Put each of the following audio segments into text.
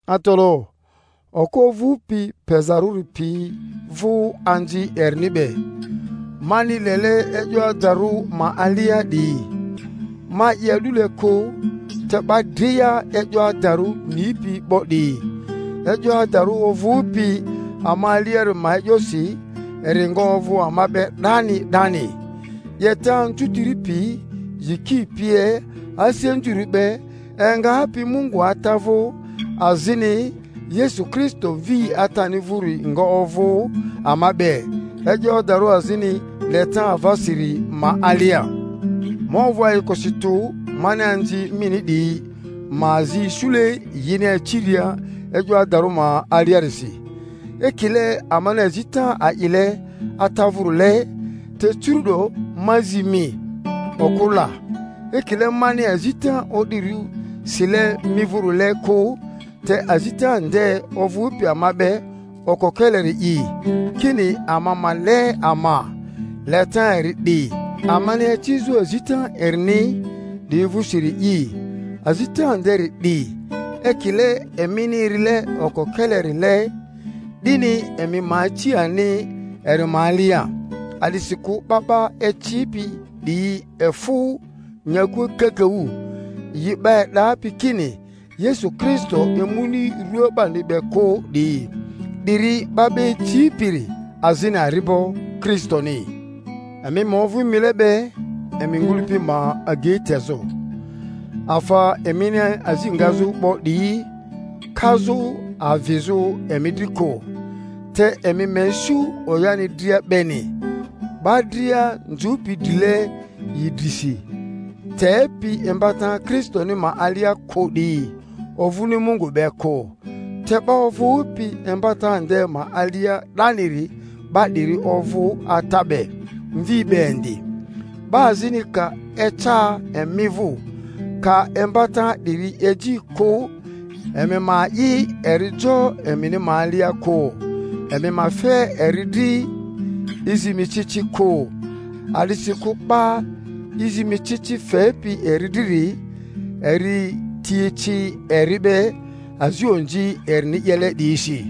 Atalaᴜ, okᴜ ovᴜpi pezarᴜri pi vᴜ anzi erini be, mani lele e'yo adarᴜ ma alia 'diyi; ma'i a'dule kᴜ, te 'ba dria e'yo adarᴜ nipi 'bo 'diyi; e'yo adarᴜ ovᴜpi ama aliari ma e'yosi, eri nga ovᴜ ama be 'dani 'dani: 'Yeta anzutiri pi, yiki pie, asi anzurᴜ be, engapi Mungu Ata vᴜ azini Yesu Kristo Mvi Atani vᴜri nga ovᴜ ama be, e'yo adarᴜ azini leta avasiri ma alia. Ma ovᴜ ayikosi tᴜ mani anzi mini 'diyi ma azi isule yini aciria e'yo adarᴜ ma aliarisi, ekile amani azita a'ile Ata vᴜrile. Te curu'do ma zi mi, okᴜ la, ekile mani azita o'dirᴜ sile mi vᴜrile kᴜ, te azita nde ovᴜpi ama be okokeleri'i, kini, ama ma le ama. Leta eri 'di, amani acizᴜ azita erini 'diyi vᴜsiri'i; azita nderi 'di, ekile emini erile okokelerile, 'dini emi ma aci ani eri ma alia. A'disikᴜ 'ba 'ba icipi 'diyi efᴜ nyakua kakaᴜ, yi 'ba e'dapi kini Yesᴜ Kristo emuni rua 'bani be kᴜ 'diyi. 'Diri 'ba 'ba icipiri azini ari'bo Kristoni. Emi ma ovᴜ mile be emi ngᴜlᴜpi ma agei tezᴜ, afa emini azi ngazᴜ 'bo 'diyi kazᴜ avizᴜ emi dri kᴜ, te emi ma isu oyani dria beni. 'Ba dria nzᴜpi drile yi drisi, tepi imbata Kristoni ma alia kᴜ 'diyi, ovᴜni Mungu be kᴜ; te 'ba ovᴜpi imbata nde ma alia 'daniri, 'ba 'diri ovᴜ Ata be, Mvi be indi. 'Ba azini ka eca emi vᴜ, ka imbata 'diri eji kᴜ, emi ma a'i eri jo emini ma alia kᴜ, emi ma fe eri dri i zi mi ci ci kᴜ; a'disikᴜ 'ba i zi mi ci ci fepi eri driri, eri ti eci eri be azi onzi erini 'yele 'diyisi.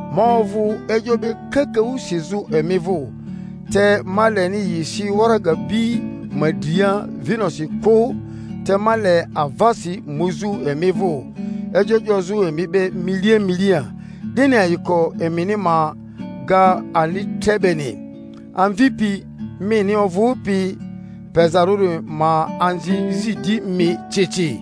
Ma ovᴜ e'yo be kakaᴜ sizᴜ emi vᴜ, te ma leni yi si waraga bi ma dria vinosi kᴜ, te ma le avasi muzᴜ emi vᴜ, e'yo 'yozᴜ emi be milia milia, 'dini ayiko emini ma ga ani tre beni. Amvipi mini ovᴜpi pezarᴜri ma anzi zi di mi ci ci.